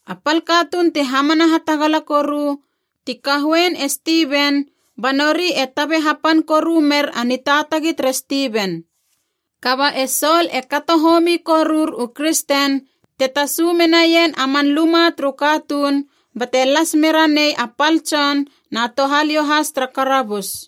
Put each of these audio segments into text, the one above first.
A pal katuun ti hamana hatagala koru ti kahoein e Stiven, ba nori e tabe hapan koru mer a nitaatagi tere Stiven. Kaba e Sol e kato homi korur u kristen te tasu menaien a man luma turu katuun bate las me ranei a pal tson na touhaliou has tara karabus.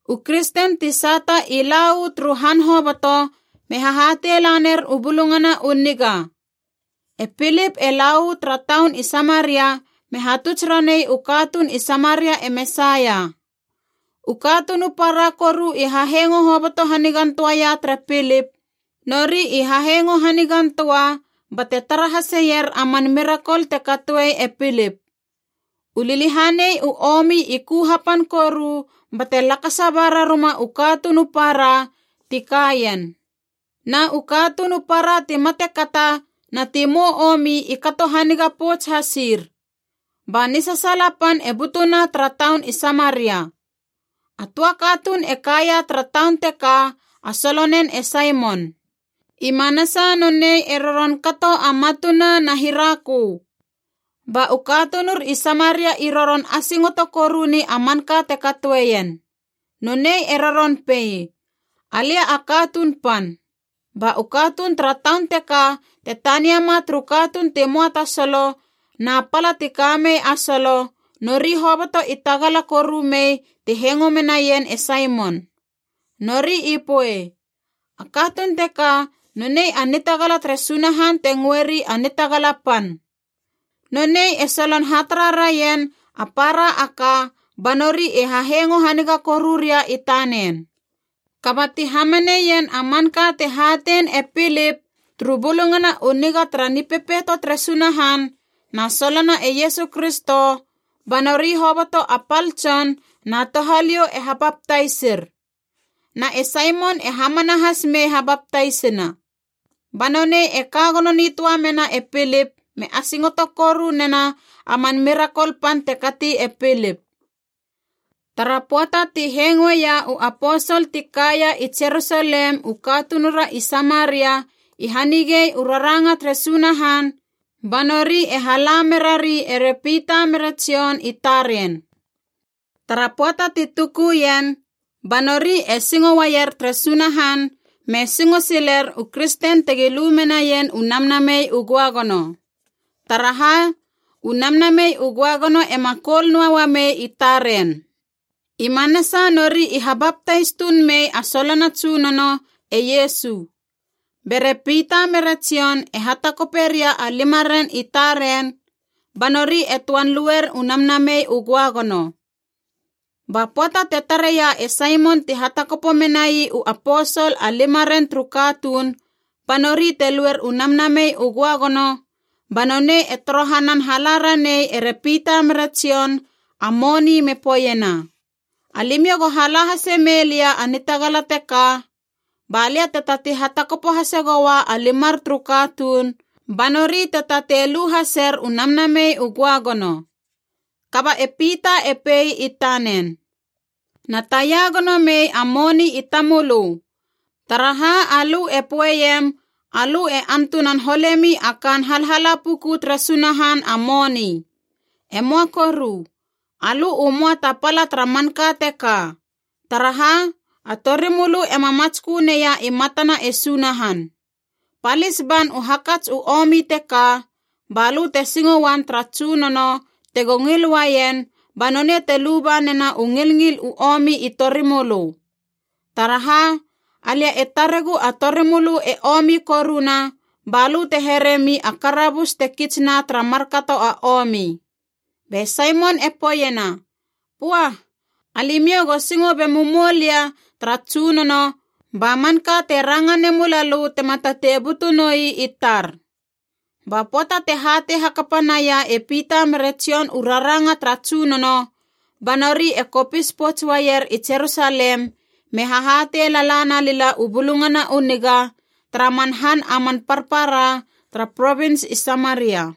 U kristen ti sata i la uu turu han hoboto me hahatei laner u Bulungana u Niga. E Pilip e la uu tara taun i Samaria me hatuts ranei u katuun i Samaria e Mesaia. U katuun u para koru i hahengo hoboto hanigan töaia tere Pilip, nori i hahengo hanigan töa bate tara haseier a man mirakol te katoe e Pilip. U liliahanei u omi i ku hapan koru bate lakasa ba raruma u katuun u para ti ka ien. Na u katuun u para ti matekata na ti mou omi i kato haniga pouts hasir. Ba nisasaala pan e butuna tara taun i Samaria. A töa katuun e kaia tara taun teka a solonen e Saimon. I manasa nonei e roron kato a matuna na hirakö. Ba u katunur i Samaria i roron asingoto koru ni a manka te katoeien. Nonei e roron pei, “Alia a katuun pan.” Ba u katuun tara taun teka te taniama turu katuun ti möa ta solo na pala ti kamei a solo, nori hoboto i tagala koru mei ti hengo menaien e Saimon. Nori i poei, “A katuun teka nonei a nitagala tere Sunahan te ngöeri a Nitagala Pan.” Nonei e solon hatara rarien a para a ka ba nori e hahengo haniga koruria i tanen. Kaba ti hamaneien a manka te hatein e Pilip turu Bulungana u Niga tara Nipepeito tere Sunahan na solona e Iesu Kristo, ba nori hoboto a pal tson na touhaliou e habaptaisir. Na e Saimon e hamana has me habaptaisina. Ba nonei e ka gono nitöa mena e Pilip me asingoto koru nena a man mirakol pan te kati e Pilip. Tara pöata ti hengoeia u aposol ti kaia i Jerusalem u katunura i Samaria i hanigei u raranga tere Sunahan, ba nori e hala merari ere Pita mere Jon i taren. Tara pöata ti tuku ien, ba nori e singo uaier tere Sunahan me singo siler u kristen tegi lu menaien u Namnamei u Göagono. Taraha, u Namnamei u Göagono ema koul noa uamei i taren. I manasa nori i habaptais tuun mei a solona Tsunono, e Iesu. Bere Pita mere Jon e hatakope ria a limaren i taren, ba nori e töan luer u Namnamei u Göagono. Ba pöata te tareia e Saimon ti hatakopo menai u aposol a limaren turu katuun ba nori te luer u Namnamei u Göagono, ba nonei e torohanan hala ranei ere Pita mere Jon a moni me poeiena, “Alimiou go hala hase mei lia a nitagala teka, ba lia te tatei hatakopo hase goua a limar turu katuun ba nori te tatei lu haser u Namnamei u Göagono.” Kaba e Pita e pei i tanen, “Na taia gono mei a moni i tamölö, taraha alö e poeiem alö e antunan holemi a kaan halhala puku tere Sunahan a moni! E möa koru, alö u möa ta pala tara manka teka, taraha a torimölö ema matskö neia i matana e Sunahan. Palis ban u hakats u omi teka, ba lö te singo uam tara Tsunono tego ngil uaien ba nonei te luba nena u ngilngil u omi i torimölö. Taraha, alia e taregu a torimölö e omi koruna, balö te heremi a karabus te kitsna tara markato a omi.” Be Saimon e poeiena, “Pua, alimiou go singo bemumoulia tara Tsunono ba manka te ranga nemulalö tema tatei butu noi i tar!” Ba pöata te hatei hakapa naia e Pita mere Jon u raranga tara Tsunono, ba nori e kopis pouts uaier i Jerusalem me hahatei lala na lila u Bulungana u Niga tara man han a man parpara tara Provins i Samaria.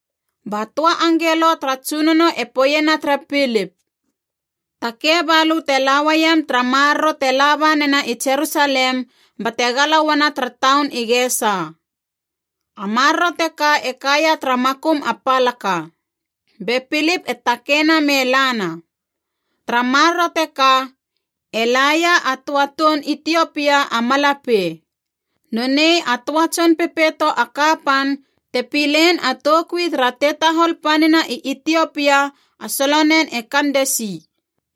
Ba töa angelo tara Tsunono e poeiena tere Pilip, “Takei balö te la uaiem tara maroro te laba nena i Jerusalem, bate gala uana tara taun i Gesa.” A maroro teka e kaia tara makum a palaka. Be Pilip e takeina me lana. Tara maroro teka e laia a töa toun Itiopia a malapei. Nonei a töa tson pepeito a kapan te pilein a toukui tara tetahol panina i Itiopia a solonen e Kandesi.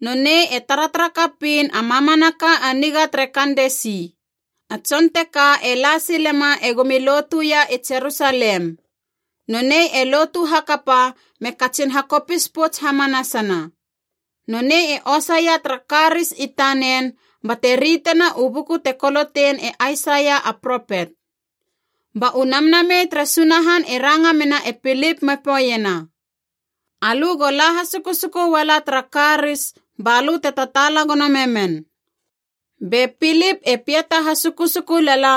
Nonei e taratara kapiin a mamanaka a niga tere Kandesi. A tson teka e la silema egomi lotuia i Jerusalem. Nonei e lotu hakapa me katsin hakopis pouts hamanasana. Nonei e osaia tara karis i tanen bate ritena u buku te kolotein e Aisaia a propet. Ba u Namnamei tere Sunahan e ranga mena e Pilip me poeiena, “Alö go la hasukusuku uala tara karis balö te tataala gono memen.” Be Pilip e piata hasukusuku lala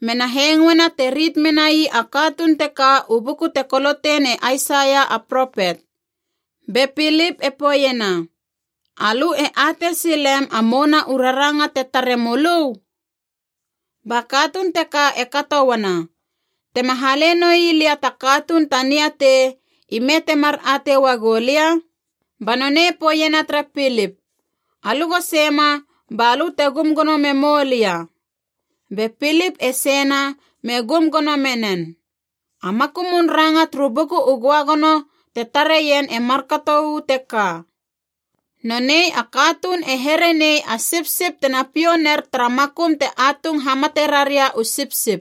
mena hengoena te rit menai a katuun teka u buku te kolotein e Aisaia a propet. Be Pilip e poeiena, “Alö e atei silem a mouna u raranga te tare mölö?” Ba katuun teka e kato uana, “Tema hale noi lia ta katuun ta niatei, ime temar atei uagou lia?” Ba nonei poeiena tere Pilip, “Alö go seima balö te gum gono memou lia.” Be Pilip e seina me gum gono menen. A makumun ranga turu Buku u Göagono te tareien e markato uu teka: “Nonei a katuun e here nei a sipsip tena piou ner tara makum te atung hamate raria u sipsip.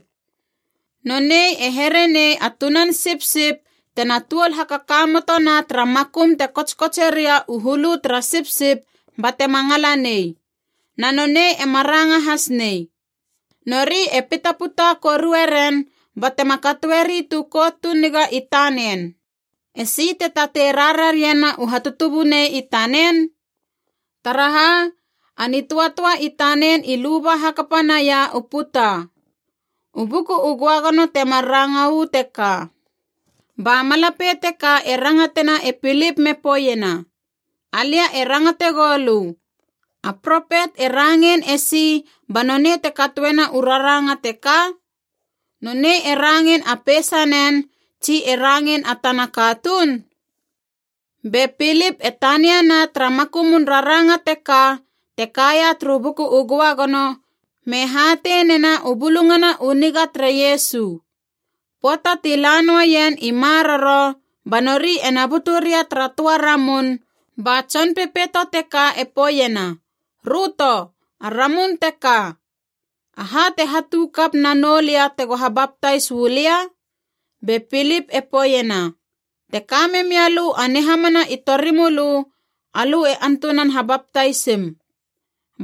Nonei e here nei a tunan sipsip tena tuol hakakamotona tara makum te kotskotseria u hulu tara sipsip batema ngala nei. Na nonei ema ranga has nei. Nori e pitaputa korue ren batema katoeri tu kout tu niga i tanen. Esi te tatei rarariena u hatutubunei i tanen? Taraha, a nitöatöa i tanen i luba hakapa naia u puta.” U Buku u Göagono temar ranga uu teka. Ba malapei teka e rangatena e Pilip me poeiena, “Alia e rangate goulö, a propet e rangein esi ba nonei te katoena u raranga teka? Nonei e rangein a peisanen, tsi e rangein a tana katuun?” Be Pilip e tania na tara makumun raranga teka te kaia turu Buku u Göagono, me hatei nena u Bulungana u Niga tere Iesu. Pöata ti la noaien i maroro ba nori ena butu ria tara töa ramun, ba tson pepeito teka e poeiena, “Röto, a ramun teka. Aha te hatu kap na noulia tego habaptais uu lia?” Be Pilip e poeiena, “Te ka memialö a nihamana i torimölö, alö e antunan habaptaisim.”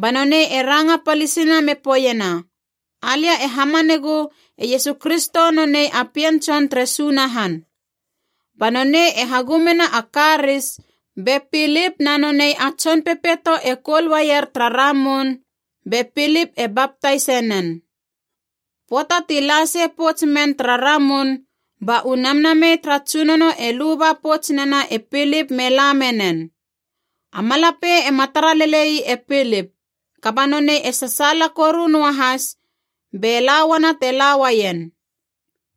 Ba nonei e ranga palisina me poeiena, “Alia e hamanegu e Iesu Kristo nonei a Pien Tson tere Sunahan.” Ba nonei e hagumena a karis, be Pilip na nonei a tson pepeito e koul uaier tara ramun, be Pilip e baptais nen. Pöata ti la sei pouts men tara ramun, ba u Namnamei tara Tsunono e luba pouts nena e Pilip me la menen. A malapei ema tara lele ii e Pilip, kaba nonei e sasaala koru noahas, be la uana te la uaien.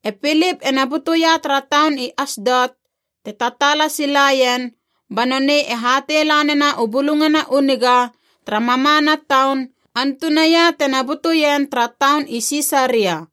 E Pilip ena butuia tara taun i Asdot te tataala silaien ba nonei e hatei lanena u Bulungana u Niga tara mamana taun, antunaia te na butuien tara taun i Sisaria.